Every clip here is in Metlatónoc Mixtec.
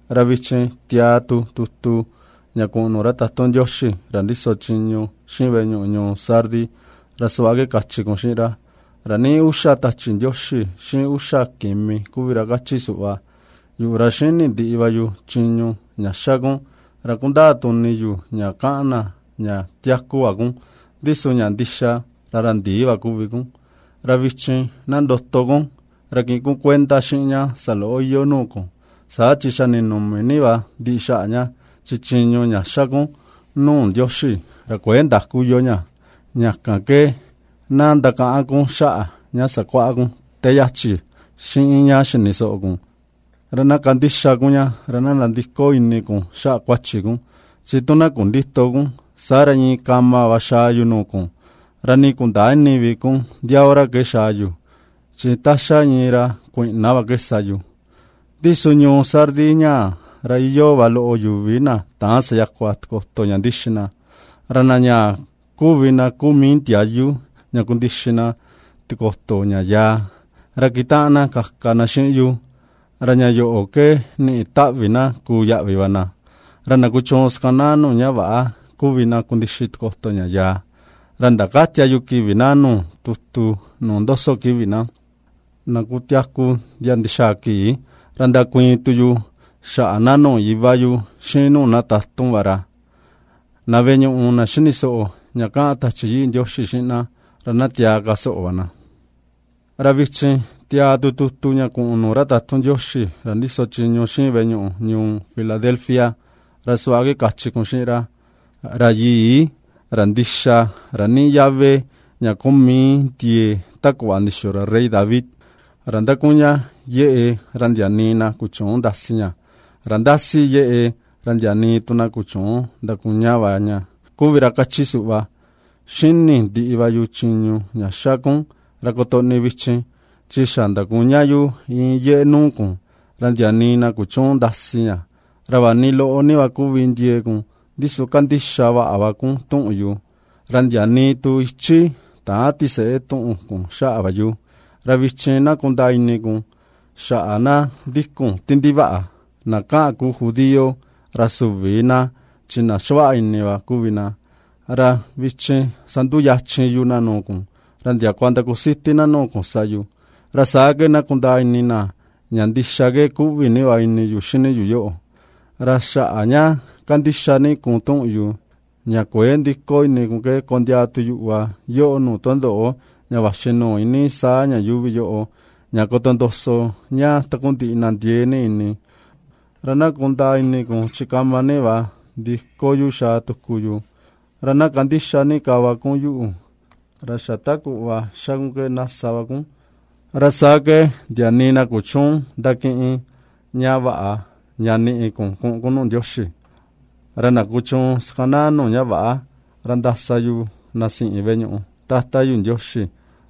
’Ra vichin tiaa tu tutu ña kuꞌun nuu ra tatun Ndioxi ra ndiso chiñu xiꞌin veꞌe ñuꞌu ñuu Sardis, ra suꞌva ke kachi kun xiꞌin ra: “Ra niꞌi uxa tachi Ndioxi, xiꞌin uxa kimi kuvi ra kachi suꞌva: Yuꞌu ra ^xíni̱ ndiꞌi va yu chiñu ña xa kun, ra kundaa tu ini yu ña kaꞌan na ña tiaku va kun, ndi su ña ndixa ra ra ndi̱ì va kuvi kun. Ra vichin na ndoto kun ra kiꞌin kun kuenda xiꞌin ña saloꞌo iyoo nuu kun, saa chi xa ninumi ni va ndiꞌi xaꞌa ña, chi chiñu ña xá kun nuu Ndioxi ra kuëe ndaku iyoo ña. Ña kan ke na ndakaꞌan kun xaꞌa ña sakuaꞌa kun te yachi, xiꞌin ña xini soꞌo kun, ra na kandixa kun ña, ra na nandiko ini kun xaꞌa kuachi kun, chi tu na kundïto kun, saa ra, iin kama va xaa yu nuu kun, ra nii kundäa ini vi kun ndia hora ke xaa yu, chi ta ^xa iin ra kuiꞌna va ke sa yu. Ndi su ñuu Sardis ñaa, ra iyoo va loꞌo yuvi na täan sayakua tikoto ña ndixi na, ra na ñaa kuvi na kuu mii ndiayu ña kundixi na tikoto ña yaa, ra kitaꞌan na kaka na xiꞌin yu, ra ña yoꞌo ke niꞌi taꞌvi na kuu yaꞌvi va na. Ra na kuchuun sakanaa nuu ña väꞌa kuvi na kundixi tikoto ña yaa, ra ndakätia yu kivi na nuu tutu, nuu ndoso kivi na, na kutiaku ndia ndixaa kii, ra ndakuiin tu yu xaꞌa na nuu Iva yu xiꞌin nuu na tatun va ra. Na veꞌe ñuꞌu, na xini soꞌo ña kaꞌan Tachi Yii Ndioxi xiꞌin na, ra na tiaa ka soꞌo va na.” ’Ra vichin tiaa tu tutu ña kuꞌun nuu ra tatun Ndioxi ra ndiso chiñu xiꞌin veꞌe ñuꞌu ñuu Filadelfia, ra suꞌva ke kachi kun xiꞌin ra: “Ra Yii, ra Ndixa, ra niꞌi yave ña kuu mii ndiee ta kuꞌva ndixiyo ra rey David, ra ^ndakuña yeꞌe ra ndia nii na kuchüun ndasi ña; ra ^ndasi yeꞌe, ra ndia nii tu na kuchüun ndakuña va ña, kuvi ra kachi suꞌva: ^Xíni̱ ndiꞌi va yu chiñu ña xa kun, ra kotoꞌni vichin chi xa ndakuña yu iin yeꞌe nuu kun, ra ndia nii na kuchüun ndakasi ña, ra vaꞌa ni loꞌo ni va kuvi ndiee kun, ndi su kandixa va kun tuꞌun yu, ra ndia nii tu ichi täan tiseꞌe tuꞌun kun xaꞌa va yu. Ra vichin ná kundaa ini kun xaꞌa na ndikun ti ndivaꞌa, na kaꞌan kuu judío, ra süvi na chi na xavaꞌa ini va kuvi na; ra vichin sanduu yachin yu na nuu kun, ra ndiakua ndakusiti na nuu kun sa yu. Ra saa ke kundaa ini na ña ndixa ke kuꞌvi ni va ini yu xini yu yoꞌo. Ra xaꞌa ña kandixa ni kun tuꞌun yu, ña kuëe ndiko ini kun ke kondiaa tu yuꞌu va yoꞌo nuu tundoꞌo, ña vaxi nuu iinii saa ña yuuvi yoꞌo, ña kotondoso ña takundiꞌi na ndiee ni ini. Ra na kundaa ini kun chi kama ni va ndiko yu xaa tuku yu, ra ná kandixa ni ka va kun yuꞌu, ra xa ta kuꞌva ^xa kun ke, ná sa va kun, ra saa ke ndia nii na kuchüun ndakiꞌin ña vaꞌa ña ni̱ꞌi̱ kun ku̱ꞌu̱n kun nuu Ndioxi. Ra na kuchuun sakanaa nuu ña väꞌa, ra ndasa yu na siꞌin veꞌe ñuꞌu Tata yu Ndioxi,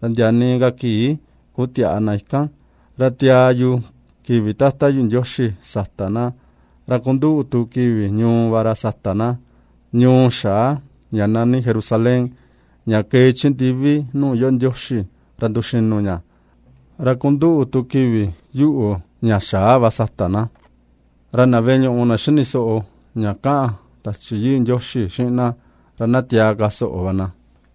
ra ndia nii ka kii kutiäꞌa na ikan, ra tiaa yu kivi Tata yu Ndioxi sata na, ra kunduꞌu tu kivi ñuu va ra sata ná, ñuu xaa, ña nani Jerusalén, ña kee chi ndivi nuu iyoo Ndioxi ra nduxinu ña; ra kunduꞌu tu kivi yuꞌu, ña xaa va, sata na. Ra na veꞌe ñuꞌu, na xini soꞌo ña kaꞌan Tachi Yii Ndioxi xiꞌin na, ra ná tiaa ka soꞌo va na.”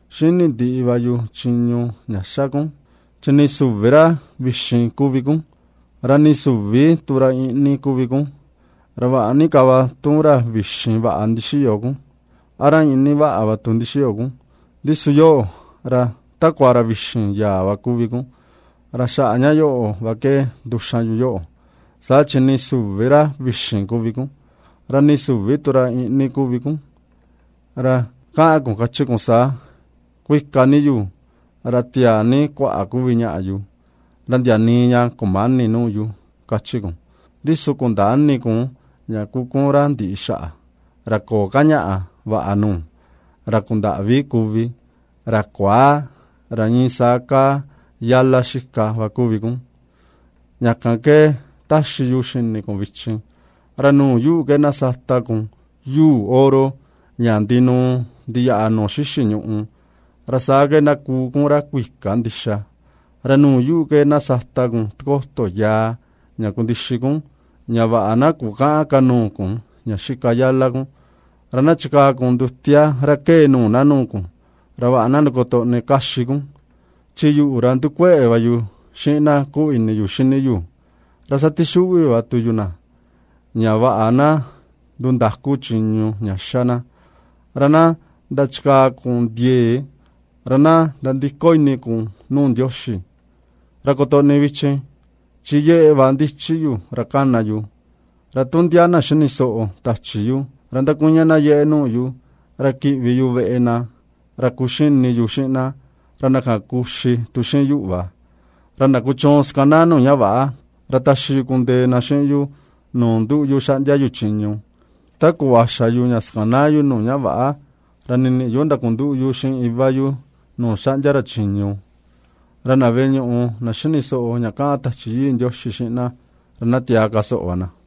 ^Xíni̱ ndiꞌi va yu chiñu ña ^xa kun, chi nii süvi ra vi̱xìn kuvi kun, ra nii süvi tu ra iꞌni kuvi kun. Ra vaꞌa ni ka va tu, tu ra vi̱xìn vaꞌa ndixíyo kun, a ra iꞌni vaꞌa va tu ndixíyo kun. Ndi su yoꞌo, ra takua ra vi̱xi̱n yaa va kuvi kun, ra xaꞌa ña yoꞌo va ke nduxan yu yoꞌo, sa chi nii süvi ra vi̱xìn kuvi kun, ra nii süvi tu ra iꞌni kuvi kun. Ra kaꞌan kun kachi kun saa: Kuika ni yu, ra tiaa ni kuaꞌa kuvi ñaꞌa yu, ra ndia nii ña kumäni nuu yu, ^kachi kun, ndi su kundäa ini kun ña kuu kun ra ndiꞌi xaꞌa, ra köo ka ña vaꞌa nuu, ra kundaꞌvi kuvi, ra kuaa, ra iin saa kaa yala xika va kuvi kun. Ña kan ke ^taxi yu xini kun vichin, ra nuu yuꞌu ke na sata kun yuu oro ña ndinuu ndiyaꞌa nuu xixi ñuꞌu, ra saa ke na kuu kun ra kuika ndixa, ra nuu yuꞌu ke, na sata kun tikoto yaa ña kundixi kun, ña vaꞌa na kukäꞌan ka nuu kun ña xika yala kun, ra ná chikaa kun ndutia ra kée nuu na nuu kun, ra vaꞌa na ndakotoꞌni kaxi kun. Chi yuꞌu, ra ndukueꞌe va yu xiꞌin na kuꞌvi ini yu xini yu, ra satixuꞌvi va tu yu na, ña vaꞌa na ndundaku chiñu ña ^xa na; ra na ndachikaa kun ndiee, ra na ndandiko ini kun nuu Ndioxi. Ra kotoꞌni vichin, chi yeꞌe va ndichi yu ra kana yu, ra tu ndia na xini soꞌo tachi yu, ra ndakuña na yeꞌe nuu yu, ra kiꞌvi yu veꞌe na, ra kuxini yu xiꞌin na, ra na kan kuxi tu xiꞌin yuꞌu va. Ra na kuchuun sakanaa nuu ña väꞌa, ra taxi yu kundee na xiꞌin yu nuu nduꞌu yu xaꞌndia yu chiñu, ta kuꞌva xa̱ yu ña xakanaa yu nuu ña väꞌa, ra ni̱niꞌi yu ndakunduꞌu yu xiꞌin Iva yu nuu xaꞌndia ra chiñu. Ra na veꞌe ñuꞌu na xini soꞌo ña kaꞌan Tachi Yii Ndioxi xiꞌin na, ra na tiaa ka soꞌo va na.”